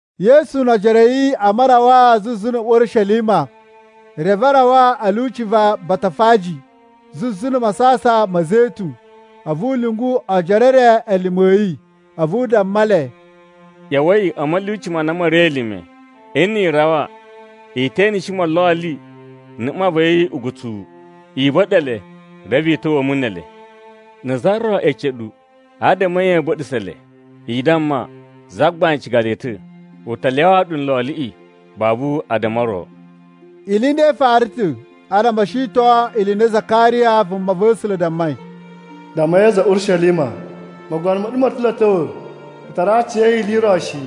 Yesu no ojoro a̱ yi a marawaa zuzu na̱ Urishelima, reve a rawa a̱ lyuci va Batafaji zuzu na̱ Masasan ma̱ Zetun. A̱vu u lyungu ojoro e re elime a̱ yi. A̱vu u damma le, “ꞌYa̱wa̱i a̱ ma̱lyuci ma na ma̱ ri elime. Nni i rawa, i te eneshi molloli na̱ mma va̱ yi ugutsuwu. I ba̱ɗa̱ le, reve i ta̱wa̱a̱ mu ne ele. Na̱ za ro ece ɗu, adama a̱ nye ya̱a̱ ba̱ɗa̱sa̱ le, i damma, ‘Zagbain ciga le ta̱!’ U ta lyawaa ɗu nloliꞌi babu addama o ro.” Ili i nda i fara ta̱ adama o shiton ili i na Zakariya vumava̱sula̱ dammai: “Dammai a̱za̱ a̱ Urishelima: ‘Mogono ma̱ ɗu moo ta̱ lo a̱ ta̱wa̱! U tara aciya̱yi ili i ro shi,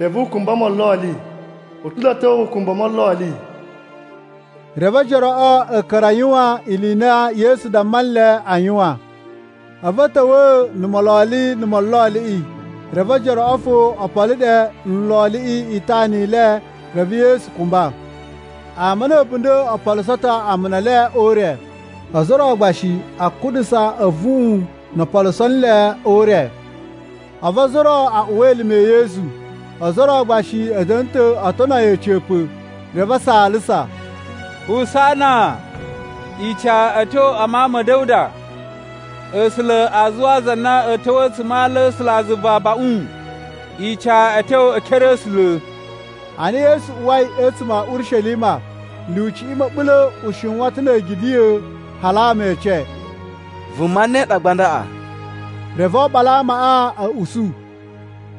reve u kumba mololi. U ta̱ lo a̱ ta̱wa̱ ukumbu o molloli.’” Reve ojoroꞌo a̱ ka̱ra̱ a yuwan ili i na Yesu damma nle a yuwan. A̱vu a̱ ta̱wa̱a̱ na̱ mololi na̱ molloliꞌi, reve ojoroꞌo fo o polo ɗe o nloliꞌi itana i le. Reve Yesu kumba. Ama na̱ a̱bunda̱ o poluso ta̱ amuna e le o ure. Ozo o ro gba shi a kuɗusa a̱vuꞌun no o poluso nle o ure. A̱vu ozo o ro a uwa elime e Yesu, ozo o ro gba shi a̱ da̱na̱ oo tono yi a̱ca̱pa̱. Reve a saalasa, “Husana! Ica a̱ tyo a Mawun ma̱ Da̱wuda!” “A̱sula̱ a zuwaa za na a̱a̱ ta̱wa̱ a̱tsuma̱ a ala a̱ A̱sulazuva abaꞌun!” “Ica a̱ tyo e ekere a̱ A̱sula̱!” Ana Yesu uwai a̱tsuma̱ a̱ Urishelima, lyuciꞌi ma̱ɓula̱ u shiwan ta̱ na̱ a̱gidiꞌya̱. Hali ama e ece, “Vuma ne ɗa gba ndaꞌa?” Reve oɓolo amaꞌa a̱ usu,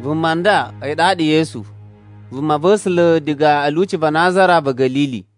“Vuma nda a̱yi ɗaɗa Yesu, vumava̱sula̱ diga a̱ lyuci va Nazara va̱ Ga̱lili.”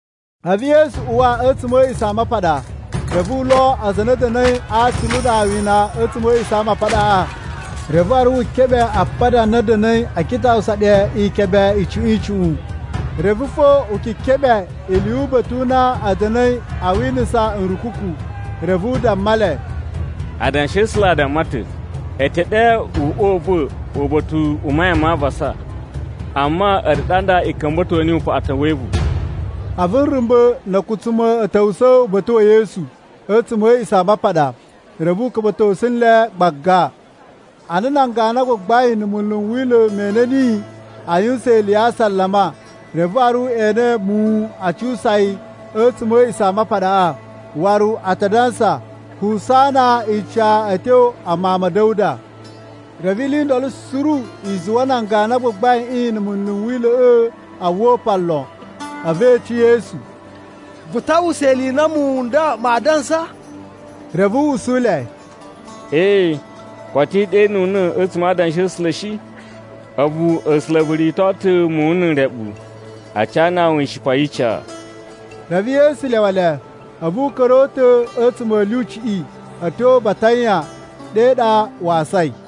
A̱vu Yesu uwa a̱tsuma̱ a̱ A̱a̱ꞌisamapaɗa, reve u lo aza a na a̱ da̱na̱i a atsulu na a wini a̱tsuma̱ a̱ A̱a̱ꞌisamapaɗaꞌa. Reve waru wu keɓe apada a na a̱ da̱na̱i a kitaꞌusa ɗe ikebe icuꞌun icuꞌun, reve fo u kekeɓe ili yu uba̱ta̱ u na a̱ da̱na̱i a winisa nrukuku. Reve u damma le, “Adanshi a̱ A̱sula̱ a damma ta̱, ‘E te ɗe uꞌwa u va̱ uba̱ta̱ u mayan ma avasa.’ Amma, a̱ɗu ɗa nda i ka̱mba̱to niyi upaꞌatan we evu.” A̱vu nrumba̱ na̱ a̱kutsuma̱ a̱ ta̱wusa̱ uba̱ta̱ wa̱ Yesu a̱tsuma̱ a̱ A̱a̱ꞌisamapaɗa, reve u ka̱mba̱tosu le gbaga. Ana nan ganu a gbagbain na̱ munlu n Wila̱ me ene niyi a yuwusan ili ya asalama, reve waru e ene muwun a cuwusa yi a̱tsuma̱ a̱ A̱a̱ꞌisamapaɗaꞌa, waru a ta dansa, “Husana! Ica a̱ tyo a Mawun ma̱ Da̱wuda.” Reve ili i ndolo suru i zuwa nan ganu a gbagbaiꞌin na̱ munlu n Wila̱ꞌa̱ a uwwa upan lon. A̱vu e ece Yesu, “Vu ta uwwusa ili i na muwun n nda maa dansa?” Reve u usu le, “Ee, koto i ɗenuna̱ a̱tsuma̱ a Adanshi a̱ A̱sula̱ shi? ‘A̱vu A̱sula̱ vu rito ta̱ muwun na̱ nreɓu a canaa wu ishipa yi ica.’” Reve Yesu lyawa le, a̱vu u ka̱ra̱ o uta̱ a̱tsuma̱ a̱ lyuciꞌi a̱ tyo Batanya, ɗe ɗa wa asai.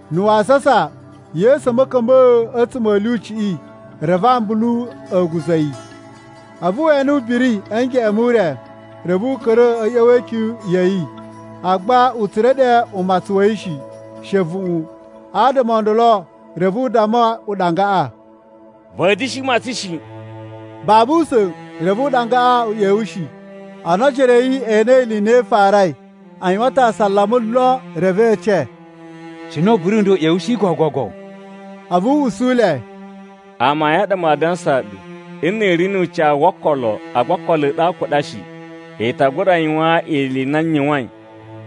Na̱ wasasa, Yesu a̱ ma̱ka̱mba̱a̱ a̱tsuma̱ a̱ lyuciꞌi, reve ambulu a̱ guza̱ yi. A̱vu we ene ubiri a̱ ngeꞌen mu ure, reve u ka̱ra̱ a̱ ꞌya̱wa̱ e ikyun ya̱ yi, agba u tsura̱ ɗe umatsun wa̱ yi shi, she a̱vuꞌun. Adama o ndolo reve u damma uɗangaꞌa, “Va̱a̱ da̱shi matsan shi!” Babu usa̱n reve uɗangaꞌa u ꞌyewushi. Ana ojoro a̱ yi e enei ili i na i farai, a yuwan ta̱ asalama lon. Reve e ece, “Cine ubiri u nda u ꞌyewushi gogogo?” A̱vu u usu le, “Amayun a ɗa maa dansaa ɗu, nni i ri nu ucawu wo okolo agba okolo a̱ ɗu a kuɗa shi, i ta gura yuwan ili i na n yuwain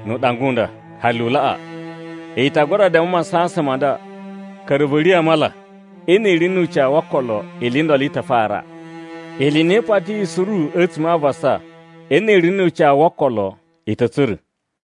nu uɗanga u nda, hali u laꞌa. I ta gura damma masasan ma nda, ‘Ka̱ra̱, vu riya̱ a mala!’ Nni i ri nu ucawu wo okolo, ili i ndolo i ta fara. Ili i na i patiyi suru a̱tsuma̱ a avasa, nni i ri nu ucawu wo okolo, i ta̱ tsura̱.”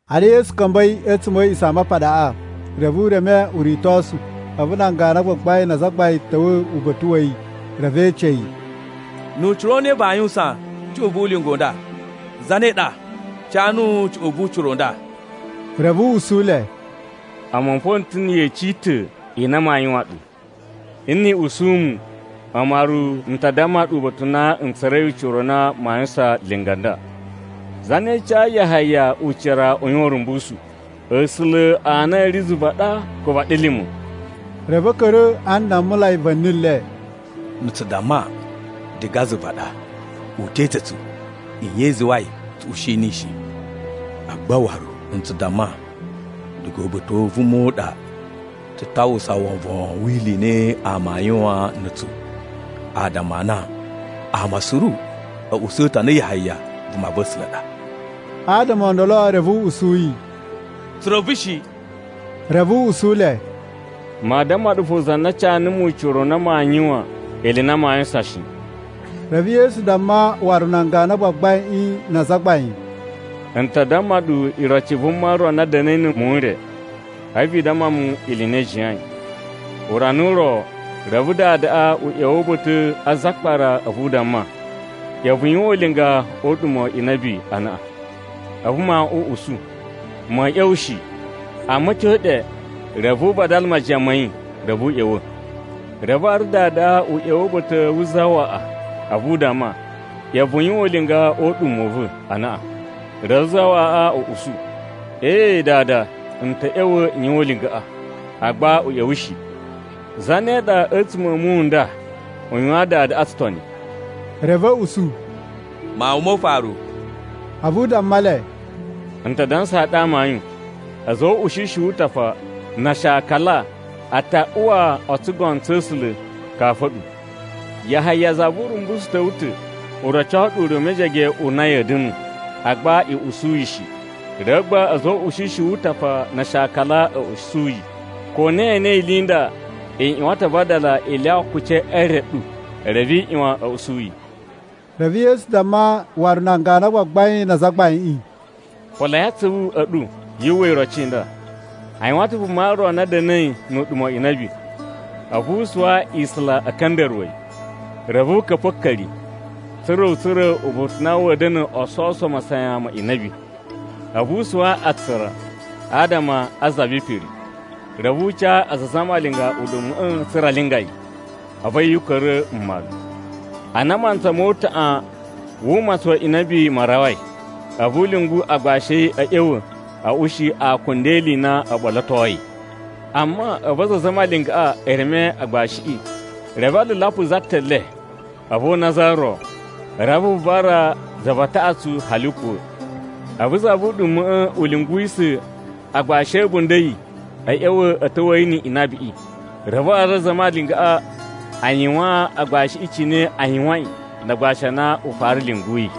Ana Yesu ka̱mba̱i a̱tsuma̱ a̱ A̱a̱ꞌisamapaɗaꞌa, reve u reme uritosu. A̱vu nan ganu a gbagbain na azagbain a̱ ta̱wa̱ uba̱ta̱ wa̱ yi, reve e ece yi, “Nu ucira u ne vaa yuwusan cuꞌun vu ulinga u nda? Zane ɗa ca nuwu cuꞌun vu ucira u nda?” Reve u usu le, “A̱mu fo n ta̱ na̱ yeci i ta̱ i na maa yuwan ɗu. Nni i usu mu, a̱mu waru n ta damma ɗu uba̱ta̱ u na n tsura̱i ucira u na maa yuwusan linga nda. Zane cayi Yahaya ucira u yuwan urumbusu? A̱sula̱ a na a̱ ri zuva ɗa, ko vaɗilima̱?” Reve a̱ ka̱ra̱ a ndammulai va̱ni le. “Nna̱ tsu damma, ‘Diga zuva ɗa,’ u te ece tsu, nye i zuwai tsu ushi niyi shi. Agba waru n tsu damma, ‘Diga uba̱ta̱ u vuma u ɗa,’ tsu ta uwwusa wovon wi ili i na ama aa yuwan na̱ a̱tsu, adama a na ama suru a̱ usu ta̱ a na Yahaya vumava̱sula̱ ɗa.” Adama o ndolo reve a̱ usu yi, “Tsu reve shi.” Reve u usu le, “Maa damma ɗu fo za na ca numu ucira u na maa yuwan ili i na maa yuwusan shi.” Reve Yesu damma waru nan ganu a gbagbain na azagbain, “N ta damma ɗu iroci i vuma ro na da̱na̱i na̱ muwun n re. A̱vu i damma mu ili i na i jiyain. Urana u ro, reve dadaꞌa u ꞌya̱wa̱ uba̱ta̱ a zakpara a̱vu u damma, ‘ꞌYa̱wa̱ vu yuwan ulinga o uɗuma̱ wa inabi anaꞌan!’ “A̱vu mawuꞌun u usu, ‘Ma̱a̱ ꞌya̱wa̱ shi!’ Amma a̱ tyo ɗe, reve u vadala majiyan ma̱ yi, reve u ꞌya̱wa̱. “Reve waru dadaꞌa u ꞌya̱wa̱ uba̱ta̱ wu zawaꞌa a̱vu u damma, ‘ꞌYa̱wa̱ vu yuwan ulinga o uɗuma̱ u va̱ anaꞌan!’ Reve zawaꞌaꞌa u usu, ‘Ee, dada, n ta̱ ꞌya̱wa̱ n yuwan ulingaꞌa!’ Agba u ꞌya̱wa̱ shi. “Zane ɗa a̱tsuma̱ a̱ muwun n nda u yuwayin dadaꞌa tsutoni?” Reve a̱ usu, “Mawun mo ufaru.” A̱vu u damma le, “N ta dansaa ɗu amayun, a̱za̱ o uꞌushishi wu utafa na ashakala a ta uwa o tsugono tsa̱ A̱sula̱ kafu a̱ɗu. Yahaya za vu Urumbusu ta̱wa̱ ta̱ u roco ɗu ure u mejege u na ya̱a̱ da̱nu. Agba i usu yi shi, reve gba a̱za̱ o uꞌushishi wu utafa na ashakala a̱ usu yi. Ko na ye enei ili i nda, i ꞌyuwan ta̱ a vadala i lyawa akuci e re ɗu, reve i ꞌyuwan a̱ usu yi.” Reve Yesu damma waru nan ganu a gbagbain na azagbain, “Poloi atsuvu a̱ ɗu yu uwwa iroci i nda: A yuwan ta̱ vuma ro na da̱na̱i nu uɗuma̱ wa inabi. A̱vu u suwa isula a̱ka̱nda̱ruwa̱ yi. Reve u ka̱pa̱ a̱a̱ka̱ri, tsa̱ra̱ u tsura̱ uba̱ta̱ u na wa̱a̱ da̱na̱ o sovuso masayan ma inabi, a̱vu u suwa atsura adama a za vi ipiri. Reve u ca aza a zamalinga uɗuma̱ꞌa̱ tsa̱ra̱ a linga yi, a̱vu a̱yi u ka̱ra̱ mmalu. Ana mantsa mo utaꞌan wu umatsun wa inabiꞌi ma rawai, a̱vu u lyungu agbashi a̱ yi a̱ ꞌya̱wa̱ a̱ ushi akunda e ili i na o ɓolotoi. “Amma a̱vu aza a zamalingaꞌa e reme agbashiꞌi. Reve a lalapa za ta̱ le, a̱vu o una za ro, reve a vuvara za va taꞌatsu hali u kuwa̱. A̱vu za vu uɗuma̱ꞌa̱ u lyunguwisa̱ agbashi a̱ a̱bunda̱ a̱ yi a̱ ꞌya̱wa̱ a̱ ta̱wa̱a̱ yi ni inabiꞌi. Reve waru aza a zamalingaꞌa a yuwaan agbashiꞌi cine a yuwain na agbashi a na u fara lyunguyi.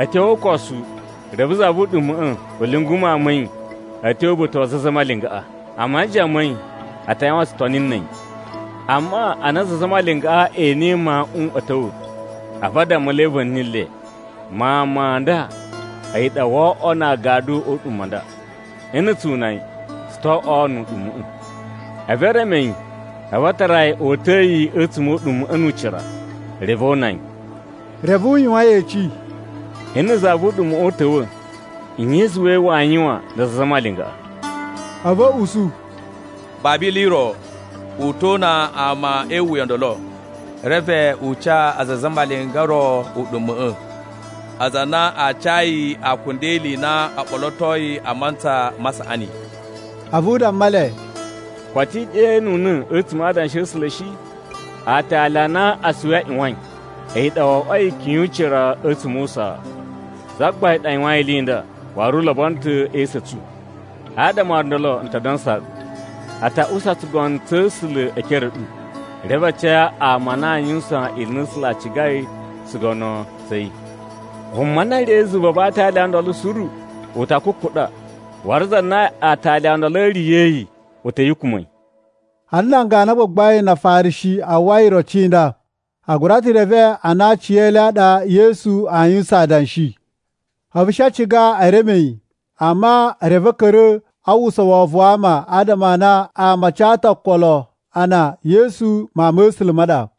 A̱ tyo o ukosu, reve za vu uɗuma̱ꞌa̱ u lyungu mawun ma̱ yi a̱ tyo uba̱ta̱ wa aza a zamalingaꞌa, a majiyan ma̱ yi a ta yuwan tsutoni na̱ a̱yi. “Amma ana aza a zamalingaꞌa e enei mawuꞌun a̱ ta̱wa̱, a̱vu a dammulai va̱ni le, ‘Mawun ma nda a̱yi ɗa woo oꞌwo na agadu o uɗuma̱ u nda. Nna̱ tsu una yi, tsu to oꞌwo nu uɗuma̱ꞌa̱!’ A̱vu e reme yi, reve a tara yi o uta̱a̱ yi a̱tsuma̱ o uɗuma̱ꞌa̱ nu ucira, reve o una yi.” Reve u yuwan yeci, “Nna̱ za vu uɗuma̱ꞌa̱ u ta̱wa̱, nye i zuwai waa yuwan na aza a zamalingaꞌa?” A̱vu a̱ usu, “Babu ili i ro, u to una ama e iwuya o ndolo, reve u ca aza a zamalinga o ro uɗuma̱ꞌa̱, aza a na aa ca yi akunda e ili i na o ɓolotoi a mantsa ma saꞌani.” A̱vu u damma le, “Koto i ɗenuna̱ a̱tsuma̱ a Adanshi a̱ A̱sula̱ shi? ‘Aatali a na asuwi a ꞌyuwain, a̱yi ɗa wo oꞌwoi ikyun yu ucira a̱tsuma̱ o usaa. Zagbain ɗa yuwain ili i nda, Waru u lobono ta̱ e esu a̱ tsu!’ “Adama o ndolo n ta dansaa ɗu, a ta usa tsugono tsa̱ A̱sula̱ e ekere a̱ ɗu, reve a ca ama a na aa yuwusan ili i na A̱sula̱ a cigai o tsugono tsa̱ yi. Vuma na riya̱i zuva va aatali o ndolo suru u ta kukuɗa, waru za na aatali o ndolo a̱ riya̱yi, u ta̱ yukuma̱ yi.” Ana nan ganu a gbagbain na Afarishi a uwwai iroci i nda, a gura ta̱ reve a na a aci e le a ɗa Yesu aa yuwusan adanshi. A̱vu a̱ shi a ciga e reme yi, amma reve a̱ ka̱ra̱ a uwwusa wovon wa ama, adama a na ama a ca ta̱ okolo a na Yesu vumava̱sula̱ ɗa.